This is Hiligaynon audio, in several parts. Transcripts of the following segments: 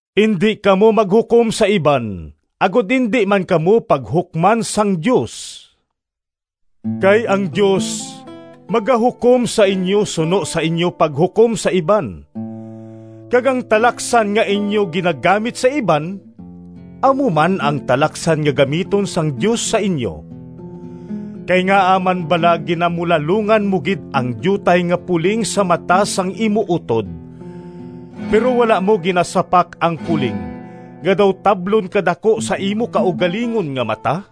“Indi kamo maghukom sa iban, agod indi man kamo paghukman sang Dios, kay ang Dios magahukom sa inyo suno sa inyo paghukom sa iban, kag ang talaksan nga inyo ginagamit sa iban, amo man ang talaksan nga gamiton sang Dios sa inyo. Kay ngaa man bala ginamulalongan mo gid ang diutay nga puling sa mata sang imo utod, pero wala mo ginasapak ang puling nga daw tablon kadaku sa imo kaugalingon nga mata?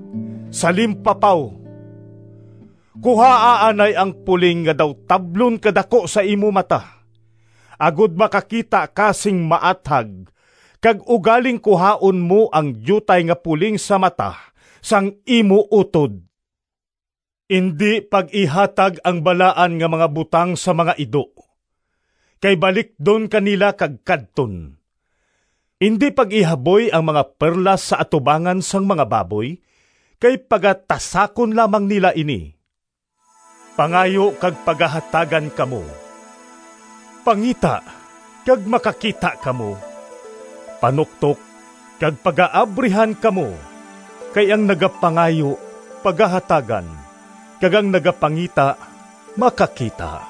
Salimpapaw! Kuhaa anay ang puling nga daw tablon kadaku sa imo mata, agod makakita ka sing maathag kag ugaling kuhaon mo ang diutay nga puling sa mata sang imo utod. “Indi pag-ihatag ang balaan nga mga butang sa mga ido, kay balikdon ka nila kag kadton. Indi pag-ihaboy ang mga perlas sa atubangan sang mga baboy kay pagatasakon lamang nila ini.” “Pangayo kag pagahatagan kamo, pangita kag makakita kamo, panuktok kag pagaabrihan kamo. Kay ang nagapangayo pagahatagan, kag ang nagapangita makakita,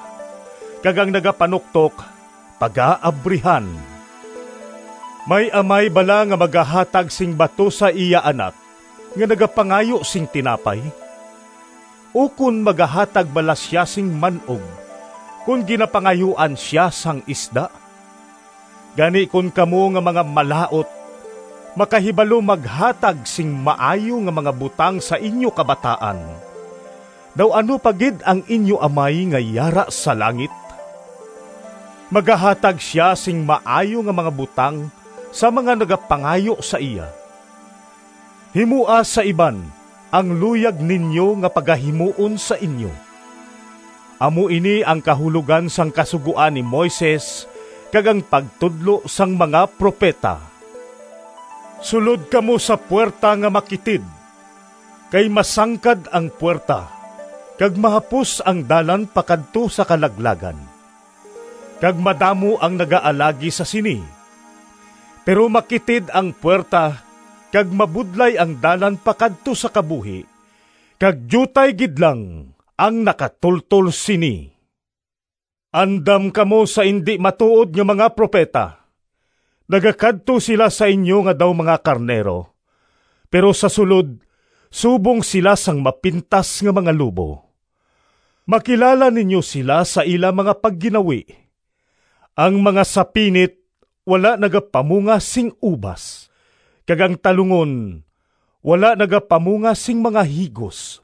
kag ang nagapanuktok pagaabrihan. May amay bala nga magahatag sing bato sa iya anak nga nagapangayo sing tinapay? Ukon magahatag bala sia sing man-og kon ginapangayuan sia sang isda? Gani kon kamo nga mga malaut makahibalo maghatag sing maayo nga mga butang sa inyo kabataan, daw ano pa gid ang inyo Amay nga yara sa langit. Magahatag sia sing maayo nga mga butang sa mga nagapangayo sa iya! “Himoa sa iban ang luyag ninyo nga pagahimuon sa inyo. Amo ini ang kahulogan sang Kasugoan ni Moises kag ang pagtudlo sang mga propeta.” “Sulod kamo sa puwerta nga makitid, kay masangkad ang puwerta kag mahapos ang dalan pakadto sa kalaglagan, kag madamo ang nagaalagi sa sini. Pero makitid ang puwerta kag mabudlay ang dalan pakadto sa kabuhi, kag diutay gid lang ang nakatultol sini.” “Andam kamo sa indi matuod nga mga propeta. Nagakadto sila sa inyo nga daw mga karnero, pero sa sulod subong sila sang mapintas nga mga lobo. Makilala ninyo sila sa ila mga pagginawi. Ang mga sapinit wala nagapamunga sing ubas, kag ang talungon wala nagapamunga sing mga higos.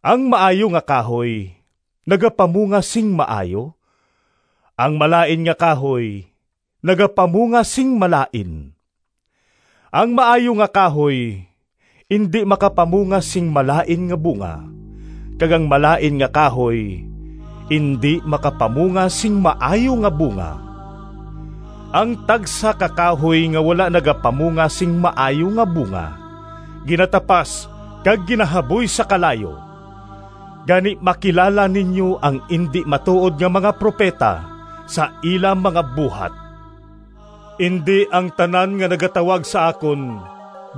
Ang maayo nga kahoy nagapamunga sing maayo; ang malain nga kahoy nagapamunga sing malain. Ang maayo nga kahoy indi makapamunga sing malain nga bunga, kag ang malain nga kahoy indi makapamunga sing maayo nga bunga. Ang tagsa ka kahoy nga wala nagapamunga sing maayo nga bunga ginatapas kag ginahaboy sa kalayo. Gani, makilala ninyo ang indi matuod nga mga propeta sa ila mga buhat.” “Indi ang tanan nga nagatawag sa akon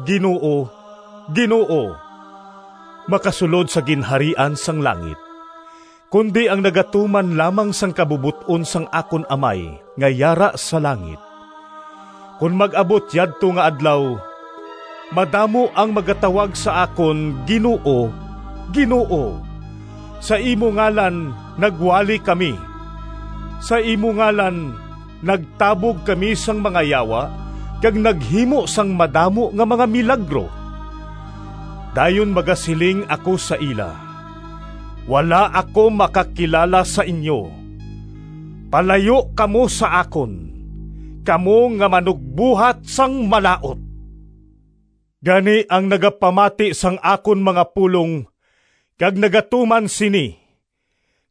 ‘Ginoo, Ginoo,’ makasulod sa Ginharian sang langit, kundi ang nagatuman lamang sang kabubot-on sang akon Amay nga yara sa langit. Kon mag-abot yadto nga Adlaw, madamo ang magatawag sa akon ‘Ginoo, Ginoo! Sa imo ngalan nagwali kami, sa imo ngalan nagtabog kami sang mga yawa kag naghimo sang madamo nga mga milagro!’ Dayon magasiling ako sa ila, ‘Wala ako makakilala sa inyo. Palayo kamo sa akon, kamo nga manugbuhat sang malaut!’” “Gani, ang nagapamati sang akon mga pulong kag nagatuman sini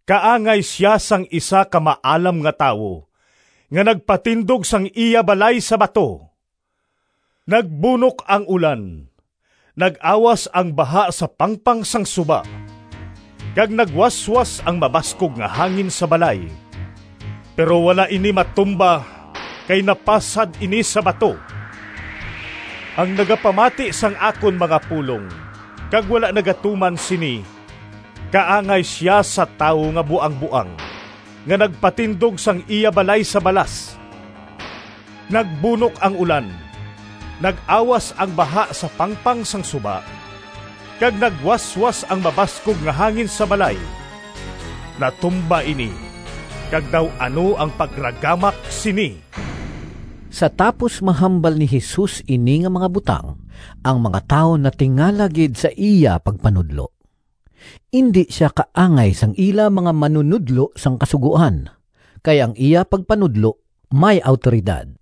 kaangay sia sang isa ka maalam nga tawo nga nagpatindog sang iya balay sa bato. Nagbunok ang ulan, nag-awas ang baha sa pangpang sang suba, kag nagwaswas ang mabaskog nga hangin sa balay. Pero wala ini matumba kay napasad ini sa bato. “Ang nagapamati sang akon mga pulong kag wala nagatuman sini, kaangay sia sa tawo nga buangboang nga nagpatindog sang iya balay sa balas. Nagbunok ang ulan, nag-awas ang baha sa pangpang sang suba, kag nagwaswas ang mabaskog nga hangin sa balay. Natumba ini kag daw ano ang pagragamak sini!” Sa tapos mahambal ni Jesus ini nga mga butang, ang mga tawo natingala gid sa iya pagpanudlo. Indi sia kaangay sang ila mga manunodlo sang Kasugoan, kay ang iya pagpanudlo may awtoridad.